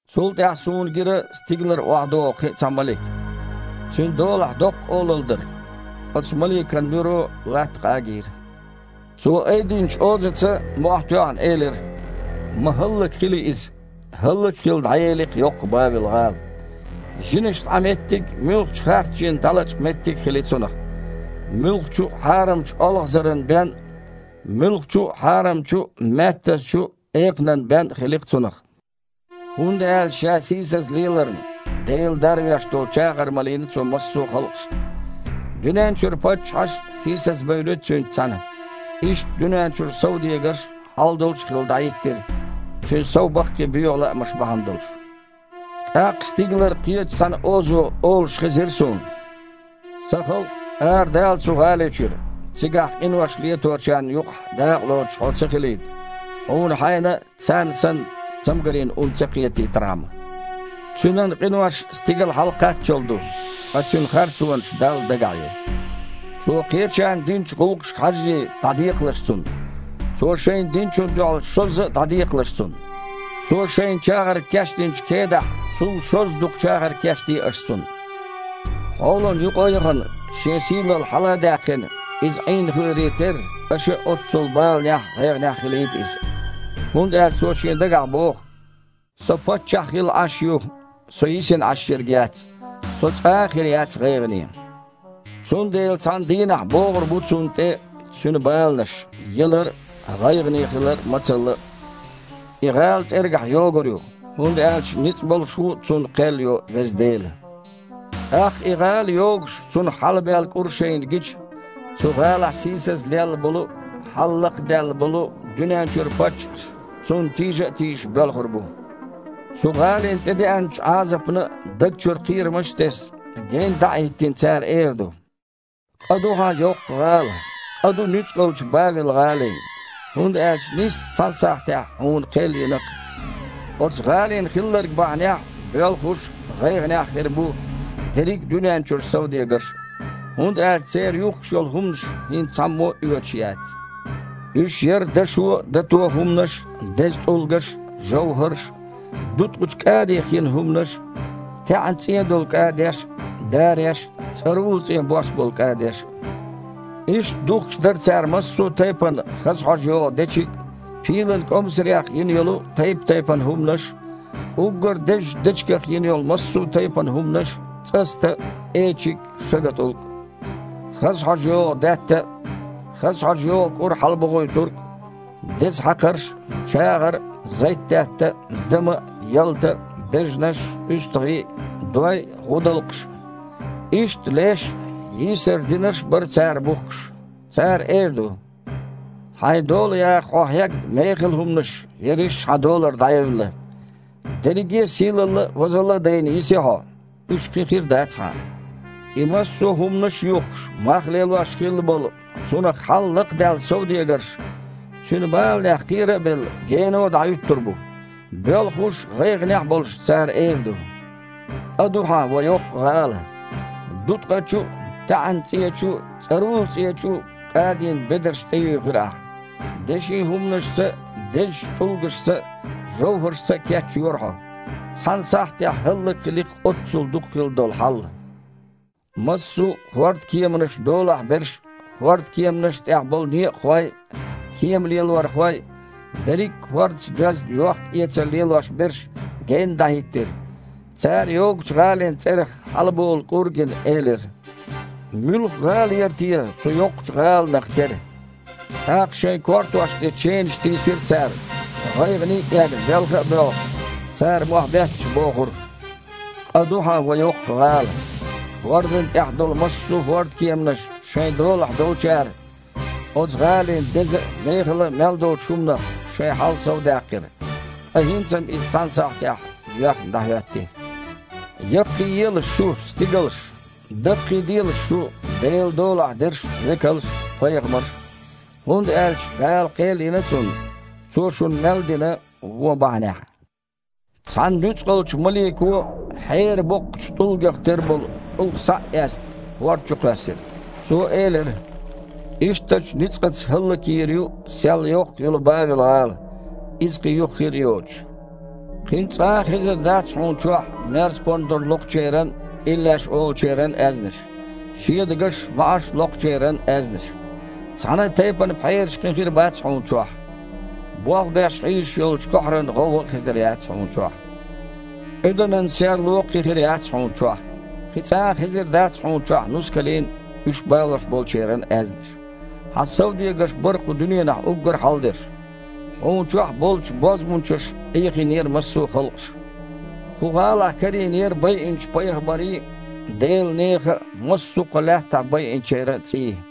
Цул тІаьхьа суна гира стигалара охьадогІу кхин а цхьа малик. Цуьнан долахь доккха олалла дара. Оцу маликан нуьро латта къагийра. Цо айдинчу озаца, мохь тоьхна, элира: «Ма хІаллакьхили иза! ХІаллак а хилла, дІаели-кх йоккха Бавел-гІала. Жинашна Іан меттиг а, муьлххачу а харц жинна дІалачкъа меттиг а хили цунах. Муьлххачу а хьарамчу олхазаран бен а, муьлххачу а хьарамчу а, маьттазчу а экханан бен а хили цунах. ХІунда аьлча ша сийсаза леларна, Дела дарвеш долу чагІар малийна цо массо а халкъашна. Дуьнен чуьра паччахьаш а сийсазбевли цуьнца цхьаьна. Иштта дуьнен чуьра совдегарш а хьал долуш хилла дІахІиттира, цуьнан сов баккхий боьха лаамаш бахьана долуш». ТІаккха стигалара кхечу цхьана озо олуш хезира суна: «Сан халкъ, арадала оцу гІали чуьра, цигахь къинош леточарна юкъахь дакъалоцуш хьо ца хилийта, хьуна хьайна а, царна санна, цамгарийн ун ца кхетийтархьама. Цуьнан къинош стигала хьалакхаччал ду. Ткъа цуьнан харцонаш Далла дагахь ю. Цо кхечарна динчу гІуллакхашка хьажжий, дІадекхалаш цунна! Цо шайна динчунна дуьхьал шозза а дІадекхалаш цунна. Цо шайна чагІар кечдинчу кедахь цул шозза дукха чагІар кечде аша цунна. Хьолана юкъа а яхана, шен сийлалла хьала а даьккхина, иза Іийна хиларе терра, аша а оццул баланехь а, гІайгІанехь а хилийта иза. ХІунда аьлча цо шен дагахь боху: „Со паччахь хилла Іаш ю. Со йисина Іаш ерг яц. Со цкъа а хир яц гІайгІане!“ Цундела цхьана дийнахь богІур бу цунна тІе цуьнан баланаш: ялар а, гІайгІане хилар а, мацалла а. И гІала цІергахь йогур ю, хІунда аьлча ницкъ болуш ву цунна кхел йо Веза Дела». ТІаккха, и гІала йогуш, цунах хьалабаьлла кІур шайна гича, цу гІалахь сийсаза лелла болу а, хьал лакхадаьлла болу а дуьнен чуьра паччахьаш, цунна тийжа а тийжаш, боьлхур бу. Цу гІалина тІедеанчу Іазапна, даг чу кхерамаш а тесна, генна дІа а хІиттина, цара эр ду: «Къа ду хьан, йоккха гІала! Къа ду нуьцкъалчу Бавел-гІалин! ХІунда аьлча нийсса цхьана сахьтехь хьуна кхел йина-кх!» Оцу гІалина хилларг бахьанехь боьлхуш а, гІайгІанехь а хир бу дерриг а дуьнен чуьра совдегарш а. ХІунда аьлча церан юхкуш йолу хІуманаш хІинца цхьаммо а оьцуш яц. Уьш яра дашо а, дато а хІуманаш а, деза тІулгаш а, жовхІарш а, дуткъачу кІадих йина хІуманаш а, таьІна-цІен долу кІадеш а, дареш а, цІарула-цІен бос болу кІадеш а. Иштта духкуш дара цара массо а тайпана хаза хьожа йогІу дечиг а, пийлан маІех йина йолу тайп-тайпана хІуманаш а, уггар а дезачу дечигах йина йолу массо а тайпана хІуманаш а, цІаста а, эчиг а, шагатІулг а, хаза хьожа йогІу даьтта а, хаза хьожа йогІу кІур хьалабохуьйтург а, деза хьакхарш а, чагІар а, зайтдаьтта а, дама а, ялта а, бежанаш а, уьстагІий а, дой а, гІудалкхаш а. Иштта леш а, йийсар динарш а бара цара бухкуш. Цара эр ду: «Хьайн дола яха хьо хьегна мехала хІуманаш ерриш а хьан долара дІаевлла. Дерриге а сийлалла а, возалла а дайна, йиси хьо. Уьш кхин хир дац хьан». И массо а хІуманаш а юхкуш, мах лелош хилла болу, цунах хьал лакхадаьлла совдегарш, цуьнан баланех кхера а белла, гено дІахІуьттур бу. Боьлхуш а, гІайгІанехь а болуш, цара эр ду: «Къа ду хьан, ва йоккха гІала! Дуткъачу а, таьІна-цІечу а, цІарула-цІечу а кІадийн бедарш тІеюьйхира ахь. Дешин хІуманашца а, дезачу тІулгашца а, жовхІаршца а кечйора хьо. Цхьана сахьтехь хІаллакьхили-кх оццул дукха хилла долу хьал!» Массо а хІордкеманаш долахь берш а, хІордкеманашна тІехь болу некъахой а, кемалелорхой а, берриг а хІордаца доьзна йохкаэцар лелош берш а генна дІахІиттира. Цара, йогучу гІалин цІерах хьалаболу кІур а гина, элира: «Муьлха гІала яра те цу йоккхачу гІаланах тера?!» ТІаккха шайн кортош тІе ченаш тийсира цара. ГІайгІане а эгна, белха а боьлхуш, цара, мохь а бетташ, бохура: «Къа ду хьан, ва йоккха гІала! ХІордана тІехь долу массо а хІордкеманаш шайн долахь долчара оцу гІалин деза а, мехала а мел долчу хІуманах шайн хьал совдаьккхира. Ткъа хІинца-м иза цхьана сахьтехь йоьхна дІахІоьтти». Яккхийэлаш шу, стигалш! Даккхийделаш шу, Делан долахь дерш а, векалш а, пайхамарш а! ХІунда аьлча Дала кхел йина цунна, цо шуна мел дина вон бахьанехь. Цхьана нуьцкъалчу малико, хьеран боккхачу тІулгах тера болу тІулг схьа а эцна, хІорда чу кхоьссира. Цо элира: «Ишттачу ницкъаца хІаллакйийр ю сел йоккха йолу Бавел-гІала, иза кхин юха хир а йоцуш! Кхин цкъа а хезар дац хьуна чохь мерз-пондар лоькхучеран а, иллеш олучеран а аьзнаш, шедагаш а, маІаш а локхучеран а аьзнаш. Цхьана а тайпана пхьераш кхин хир бац хьуна чохь. Болх беш хьийзаш йолчу кохьаран гІовгІа а хезар яц хьуна чохь. Къуьданан серло а кхин хир яц хьуна чохь. Кхин цкъа а хезар дац хьуна чохь нускалийн а, уьш балош болчеран а аьзнаш. Хьан совдегарш бара кху дуьненахь уггар а хьалдерш. Хьуна чохь болчу бозбунчаша Іехийнера массо а халкъаш». Кху гІалахь карийнера байинчу пайхамарийн а, Делан нехан а, массо а кху лаьттахь байинчеран а цІий!